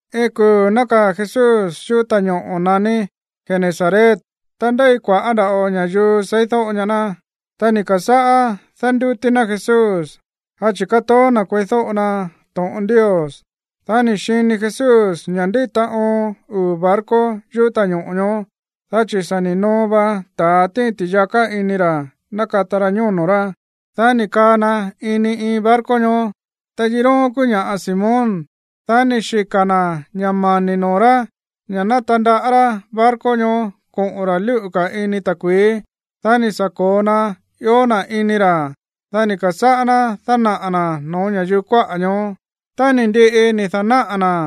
Iin kuu̱ nákaa̱ Jesús yuꞌú ta̱ñoꞌo̱ naní Genesaret. Ta ndéi kua̱ꞌá nda̱ꞌo ña̱yuu seídóꞌo ñaá ná. Ta ni̱ ka̱sáꞌá dándútí ná Jesús, dá chi̱ kátoó na̱ kueídóꞌo na to̱ꞌon Ndios. Dá ni̱ xini Jesús ña̱ ndíta oon uu̱ barco yuꞌú ta̱ñoꞌo̱ ñoó, dá chi̱ sa̱ ni̱ noo va ta̱a tíin ti̱yaká ini ra̱ nakata ra ñóno̱ rá. Dá ni̱ kaa na ini iin barco ñoó, ta yiróón kúú ña̱ꞌa Simón, dá ni̱ xika̱ na̱ ña̱ mani̱ noo̱ rá ña̱ ná tandaꞌá rá barco ñoó koꞌo̱n ra̱ lúꞌu̱ ka̱ ini ta̱kui̱í. Dá ni̱ sa̱ ko̱o na ió na̱ ini ra̱, dá ni̱ ka̱sáꞌá ná dánaꞌa̱ na̱ no̱ó ña̱yuu kuáꞌa̱ ñoó. Tá ni̱ ndiꞌi ni̱ da̱náꞌa̱ na̱,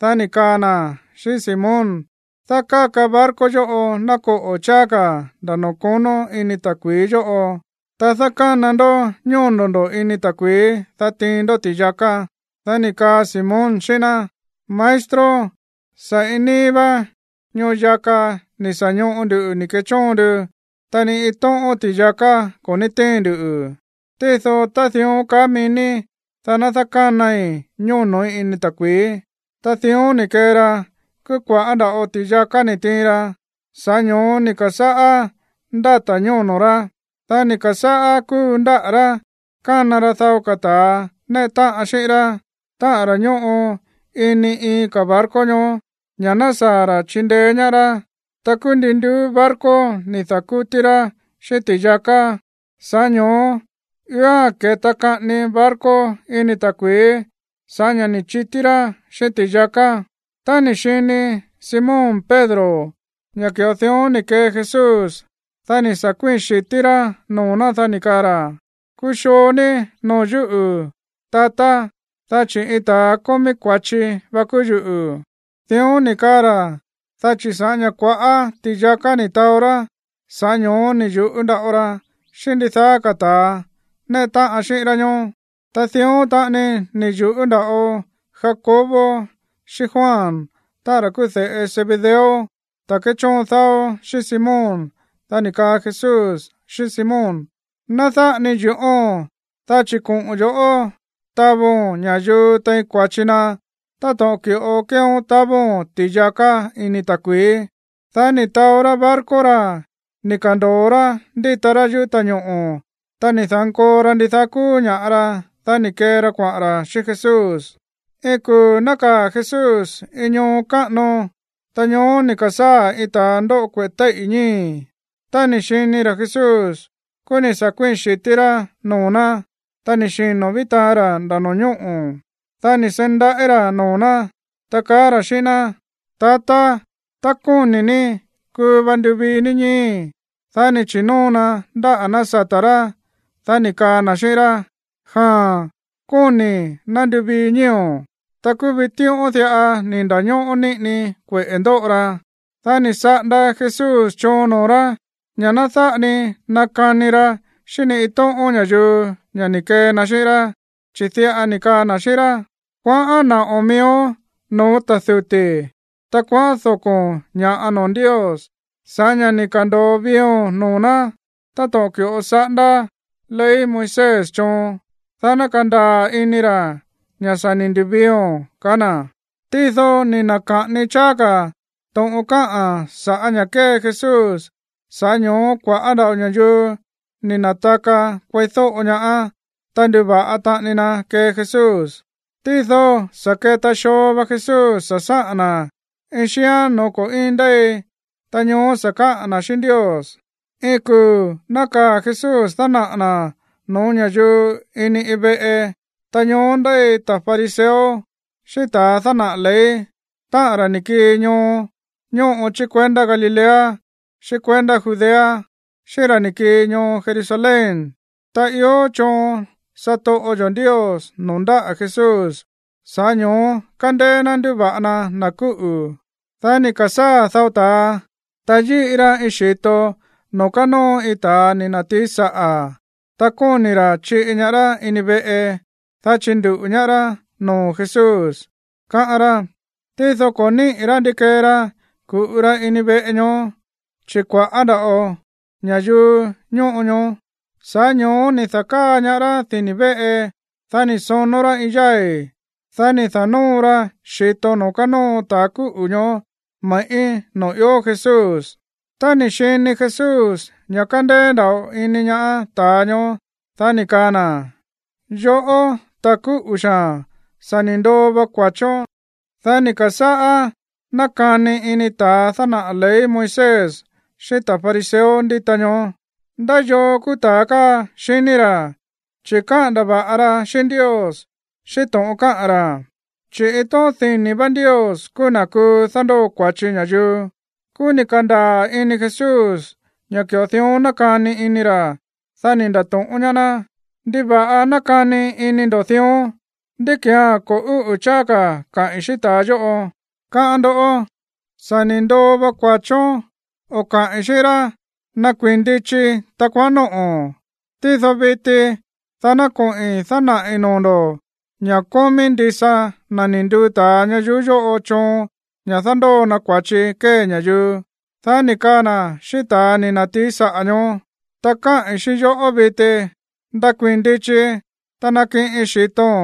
dá ni̱ kaa na̱ xíꞌín Simón: ―Dákáka barco yóꞌo ná koꞌo̱ cháá ka̱ nda̱ noo̱ konó ini ta̱kui̱í yóꞌo, ta dákána ndó ñóno̱ ndo̱ ini ta̱kui̱í, dá tiin ndó ti̱yaká. Dá ni̱ kaa Simón xíꞌín ná: ―Maestro, sa̱ iin níí vá ñoo yaka ni̱ sa̱ ñoꞌo ndu ni̱ ke̱chóon ndu, ta ni iin tóꞌón ti̱yaká ko̱ ní tíin ndu. Tído tá dión kaá mií ní, dá ná dákánai ñóno̱í ini ta̱kui̱í. Ta dión ni̱ kee ra. Kúú kua̱ꞌá nda̱ꞌo ti̱yaká ni̱ tiin ra, sa̱ꞌá ño̱ó ni̱ ka̱sáꞌá ndáta̱ ñóno̱ rá. Dá ni̱ ka̱sáꞌá kúu ndáꞌa̱ rá kána ra dao ka̱ ta̱a néꞌe táꞌan xíꞌín rá, táꞌa̱n ra̱ ñóꞌo ini iin ka̱ barco ñoó, ña̱ ná saa̱ ra̱ chindeé ñaá rá. Ta kúú ndin nduú barco ni̱ da̱kútí rá xíꞌín ti̱yaká. Sa̱ꞌá ño̱ó i̱oa̱n ke̱ta kaꞌani barco ini ta̱kui̱í sa̱ꞌá ña̱ ni̱ chití rá xíꞌín ti̱yaká. Tá ni̱ xini Simón Pedro ña̱ ki̱ꞌo dión ni̱ kee Jesús, dá ni̱ sa̱ kuíi̱n xi̱tí rá noo̱ ná, dá ni̱ kaa ra̱: ―Kuxoo ní noo̱ yúꞌu̱, tatá, dá chi̱ iin ta̱a kómí kua̱chi va kúú yuꞌu̱. Dión ni̱ kaa ra̱, dá chi̱ sa̱ꞌá ña̱ kua̱ꞌá ti̱yaká ni̱ taó rá, sa̱ꞌá ño̱ó ni̱ yu̱ꞌú nda̱ꞌo ra xíꞌín ndidaá ka̱ ta̱a néꞌe táꞌan xíꞌín rá ñoó. Ta dión taꞌani ni̱ yu̱ꞌú nda̱ꞌo Jacobo xíꞌín Juan, táꞌa̱n ra̱ kúú de̱ꞌe Zebedeo, ta̱ kéchóon dáó xíꞌín Simón. Dá ni̱ kaa Jesús xíꞌín Simón: ―Ná dáꞌa ni yu̱ꞌóo̱n, dá chi̱ koꞌo̱n yo̱ꞌó tavo̱n ña̱yuu tein kua̱chi na táto̱ꞌon ki̱ꞌo kéeón tavo̱n ti̱yaká ini ta̱kui̱í. Dá ni̱ taó rá barco ra̱ ni̱ ka̱ndo̱o rá ndíta rá yuꞌú ta̱ñoꞌo̱. Ta ni̱ da̱nkoo ra ndidaá kúú ña̱ꞌa ra, dá ni̱ kee ra kuaꞌa̱n ra̱ xíꞌín Jesús. Iin kuu̱ nákaa̱ Jesús iin ñoo káꞌano. Ta ñoó ni̱ ka̱sáa̱ iin ta̱a ndóꞌo kueꞌe̱ téíꞌi̱ ñíi̱. Tá ni̱ xini ra̱ Jesús, kúú ni̱ sa̱ kuíi̱n xi̱tí rá noo̱ ná. Ta ni̱ xino̱ ví taan ra̱ nda̱ no̱ñóꞌo̱. Dá ni̱ seí ndaꞌí ra̱ noo̱ ná, ta kaá ra̱ xíꞌín ná: ―Tatá, tá kóni̱ ní, kuu va nduvii ní ñíi̱í. Dá ni̱ chi̱nóo na ndáꞌa̱ ná sata̱ rá, dá ni̱ kaa na̱ xíꞌín rá: ―Jaa̱n, kóni̱i̱. Ná nduvii ñíi̱o̱n. Ta kúú vitíꞌón diꞌa ni̱ nda̱ñóꞌó níꞌini kueꞌe̱ ndóꞌo ra. Dá ni̱ saꞌanda Jesús choon noo̱ rá ña̱ ná dáꞌa ni nakani ra xíꞌín ni iin tóꞌón ña̱yuu ña̱ ni̱ kee na xíꞌín rá, chi̱ diꞌa ni̱ kaa na̱ xíꞌín rá: ―Kuaꞌán naꞌo̱n miíón no̱ó ta̱ duti̱, ta kuaꞌán doko̱n ña̱ꞌa noo̱ Ndios sa̱ꞌá ña̱ ni̱ ka̱ndo̱o viio̱n noo̱ ná, táto̱ꞌon ki̱ꞌo saꞌándá ley Moisés choon, dá ná kandaa̱ ini ra̱ ña̱ sa̱ ni̱ ndu̱viio̱n ―kaá na̱. Tído ni̱ na̱ka̱ꞌani cháá ka̱ to̱ꞌon káꞌa̱n sa̱ꞌá ña̱ kée Jesús. Sa̱ꞌá ño̱ó kua̱ꞌá nda̱ꞌo ña̱yuu ni̱ na̱taka kueídóꞌo ñaá, ta nduva̱ꞌa taꞌani na kee Jesús. Tído sa̱ keta xoo va Jesús sa̱ sáꞌa̱n na̱ dao ka̱ xíán no̱ó ko̱ íin ndéi. Ta ñoó sa̱ káꞌa̱n na̱ xíꞌín Ndios. Iin kuu̱ nákaa̱ Jesús dánaꞌa̱ na̱ no̱ó ña̱yuu ini iin veꞌe. Ta ñoó ndéi ta̱ fariseo xíꞌín ta̱ dánaꞌa̱ ley, táꞌa̱n ra̱ ni̱ kii ñoo ñóꞌo chí kuendá Galilea xíꞌín kuendá Judea, xíꞌín ra̱ ni̱ kii ñoo Jerusalén. Ta ió choon satoꞌo yo̱ Ndios noo̱ ndáꞌa̱ Jesús, sa̱ꞌá ño̱ó kándéé ná ndúva̱ꞌa na na̱ kúꞌu̱. Dá ni̱ ka̱sáa̱ dao ta̱a, ta yíꞌi ra iin xi̱to noo̱ kánóo iin ta̱a ni̱ na̱tií saꞌa̱, ta kóni̱ ra̱ chiꞌi ñaá rá ini veꞌe, dá chinduꞌu̱ ñaá rá noo̱ Jesús, káꞌán rá. Tído ko̱ níꞌi̱ rá ndi kee ra ku̱ꞌu ra ini veꞌe ñoó, chi̱ kua̱ꞌá nda̱ꞌo ña̱yuu ñóꞌo ñoó. Sa̱ꞌá ño̱ó ni̱ da̱káa ñaá rá dini̱ véꞌe. Dá ni̱ sonó rá iin yái̱. Dá ni̱ da̱nóo ra xi̱to noo̱ kánóo ta̱ kúꞌu̱ ñoó me̱ꞌí noo̱ ió Jesús. Tá ni̱ xini Jesús ña̱ kándéé nda̱ꞌo ini ñaá ta̱a ñoó, dá ni̱ kaa na̱: ―Yoꞌó, ta̱ kúꞌu̱ xaa̱n, sa̱ ni̱ ndoo va kua̱chón. Dá ni̱ ka̱sáꞌá nákani ini ta̱a dánaꞌa̱ ley Moisés xíꞌín ta̱ fariseo ndíta ñoó. “¿Ndá yoo kúú ta̱a káa, xiní ra̱, chi̱ káꞌa̱n ndava̱ꞌa ra xíꞌín Ndios xíꞌín to̱ꞌon káꞌa̱n ra̱? Chi̱ iin tóꞌón dini̱ vá Ndios kúú na̱ kuu dándóo kua̱chi ña̱yuu.” Kúú ni̱ ka̱ndaa̱ ini Jesús ña̱ ki̱ꞌo dión nákani ini ra̱. Dá ni̱ nda̱to̱ꞌón ñaá ná: ―¿Ndiva̱ꞌa nákani ini ndo̱ dión? ¿Ndí ki̱án ko̱ úꞌu̱ cháá ka̱ kaꞌi̱n xíꞌín ta̱a yóꞌo, káꞌán ndoꞌó: “Sa̱ ni̱ ndoo va kua̱chón”, o kaꞌi̱n xíꞌín rá: “Ndakuii̱n ndichi, ta kuaꞌán nóꞌo̱n”? Tído viti dá ná koꞌi̱n dánaꞌi̱ noo̱ ndo̱ ña̱ kómí ndisa na̱ ni̱ nduu ta̱a ñayuú yóꞌo choon ña̱ dándóo na kua̱chi kómí ña̱yuu. Dá ni̱ kaa na̱ xíꞌín ta̱ ni̱ na̱tií saꞌa̱ ñoó: ―Ta káꞌi̱n xíꞌín yoꞌó viti. Ndakuii̱n ndichi, ta nakiꞌin xi̱to̱n,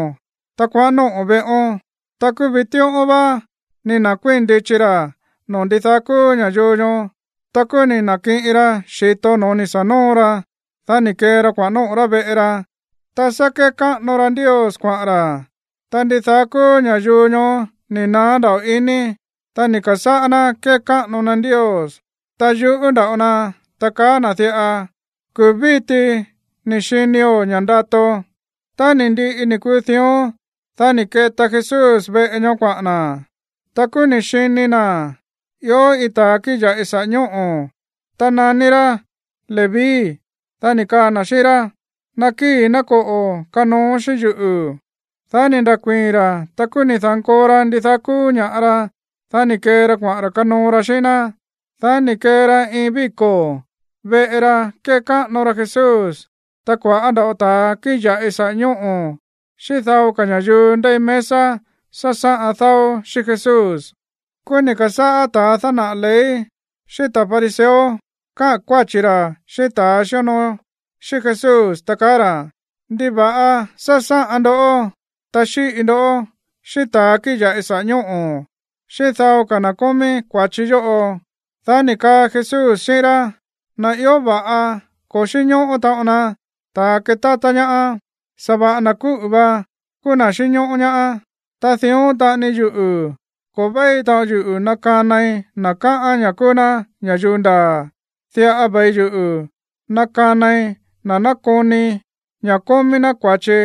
ta kuaꞌán nóꞌo̱ veꞌón. Ta kúú vitíꞌón vá ni̱ na̱kuíi̱n ndichi ra̱ noo̱ ndidaá kúú ña̱yuu ñoó. Ta kúú ni̱ na̱kiꞌin ra xi̱to no̱ó ni̱ sa̱ nóo ra. Dá ni̱ kee ra kuaꞌa̱n nóꞌo̱ rá veꞌe ra, ta sá kékáꞌano ra Ndios kuaꞌa̱n ra̱. Ta ndidaá kúú ña̱yuu ñoó ni̱ naá nda̱ꞌo iní, ta ni̱ ka̱sáꞌá ná kékáꞌano na Ndios. Ta yu̱ꞌú nda̱ꞌo na, ta kaá na̱ diꞌa: ―Kuu̱ víti ni̱ xinio̱ ña̱ꞌa ndato. Tá ni̱ ndiꞌi ni̱ kuu dión, dá ni̱ keta Jesús veꞌe ñoó kuaꞌa̱n na̱. Ta kúú ni̱ xini na̱ ió iin ta̱a kíꞌin ya̱ꞌi saꞌa̱ ñóꞌo̱, ta naní rá Leví. Dá ni̱ kaa na̱ xíꞌín rá: ―Nakíi̱, ná koꞌo̱ kanooón xíꞌín yuꞌu̱. Dá ni̱ nda̱kuíi̱n ra̱. Ta kúú ni̱ da̱nkoo ra ndidaá kúú ña̱ꞌa ra, dá ni̱ kee ra kuaꞌa̱n ra̱ kanoo ra xíꞌín ná. Dá ni̱ kee ra iin víko̱ veꞌe ra kekáꞌano ra Jesús. Ta kua̱ꞌá nda̱ꞌo ta̱a kíꞌin ya̱ꞌi saꞌa̱ ñóꞌo̱, xíꞌín dao ka̱ ña̱yuu ndéi mesa sásáꞌan dáó xíꞌín Jesús. Kúú ni̱ ka̱sáꞌá ta̱ dánaꞌa̱ ley xíꞌín ta̱ fariseo káꞌa̱n kuáchi̱ ra̱ xíꞌín ta̱a xíonoo xíꞌín Jesús, ta kaá ra̱: ―¿Ndiva̱ꞌa sásáꞌan ndó, ta xíꞌi ndó xíꞌín ta̱a kíꞌin ya̱ꞌi saꞌa̱ ñóꞌo̱, xíꞌín dao ka̱ na̱ kómí kua̱chi yóꞌo? Dá ni̱ kaa Jesús xíꞌín rá: ―Na̱ ió va̱ꞌa ko̱ xínñóꞌó taꞌon na ta̱a ketátá ñaá. Sa̱va̱ꞌa na̱ kúꞌu̱ va kúú na̱ xínñóꞌó ñaá. Ta dión taꞌani yuꞌu̱, ko̱ véi taꞌon yuꞌu̱ nakanai na̱ káꞌán ña̱ kúú ná ña̱yuu ndaa̱. Diꞌa ve̱i yuꞌu̱ nakanai na̱ nákoni ña̱ kómí ná kua̱chi,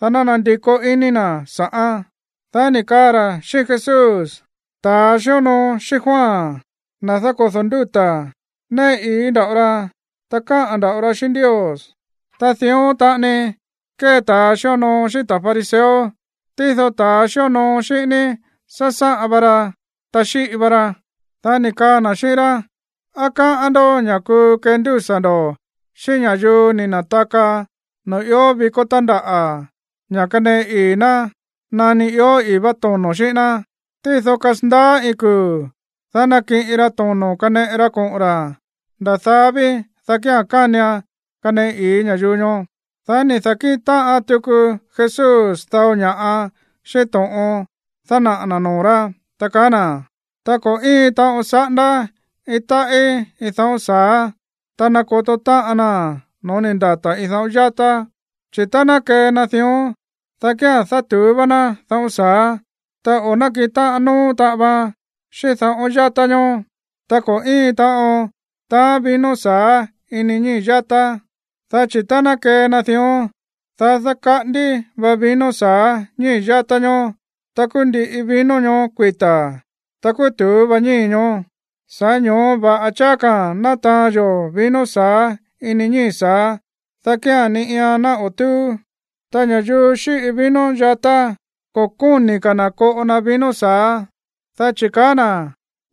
dá ná nandikó iní na̱ sa̱ꞌán. Dá ni̱ kaa ra̱ xíꞌín Jesús: ―Ta̱a xíonoo xíꞌín Juan, na̱ dákodo̱ ndúta̱, néꞌe ii̱ nda̱ꞌo ra, ta káꞌa̱n nda̱ꞌo ra xíꞌín Ndios, ta dión taꞌani kée ta̱a xíonoo xíꞌín ta̱ fariseo, tído ta̱ xíonoo xíꞌín ní sásáꞌan va ra, ta xíꞌi va ra. Dá ni̱ kaa na̱ xíꞌín rá: ―¿Á káꞌán ndó ña̱ kuu kendúsa̱ ndo̱ xíꞌín ña̱yuu ni̱ na̱taka noo̱ ió vikó tándaꞌa̱ ña̱ kaneꞌe ii̱ ná nani ió i̱í vá tono̱ xíꞌín ná? Tído kasandaá iin kuu̱, dá nakiꞌin ra tono̱ kaneꞌe ra koꞌo̱n ra̱. Nda̱ daá ví, dá kía̱n kánian kaneꞌe ii̱ ña̱yuu ñoó. Dá ni̱ da̱kíꞌin táꞌan tuku Jesús dao ña̱ꞌa xíꞌín to̱ꞌon dánaꞌa̱ na̱ noo̱ rá, ta kaá na̱: ―Ta ko̱ íin taꞌon saꞌándá iin táꞌí iin dáꞌo̱n sa̱á, ta nákoto táꞌan naa̱n no̱ó ni̱ ndata̱ iin daꞌón yátá, chi̱ tá ná kee na dión, dá kía̱n dátu̱ú vá ná dáꞌo̱n sa̱á, ta o̱ nákiꞌin táꞌan nóó taꞌan vaan xíꞌín daꞌón yátá ñoó. Ta ko̱ íin taꞌon taán vino sa̱á ini ñíi̱ yátá, dá chi̱ tá ná kee na dión, dá dákaꞌándí va vino sa̱á ñíi̱ yátá ñoó, ta kúú ndiꞌi vino ñoó kuita̱, ta kúú tu̱ú vá ñíi̱ ñoó. Sa̱ꞌá ño̱ó va̱ꞌa cháá ka̱ ná taán yó vino sa̱á ini ñíi̱ sáá, dá kía̱n ni iian ná o̱ túú. Ta ña̱yuu xíꞌi vino yatá, ko̱ kóni̱ ka̱ na̱ koꞌo na vino sa̱á, dá chi̱ kaá na̱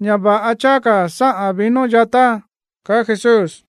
ña̱ va̱ꞌa cháá ka̱ sáꞌa̱n vino yatá ―kaá Jesús.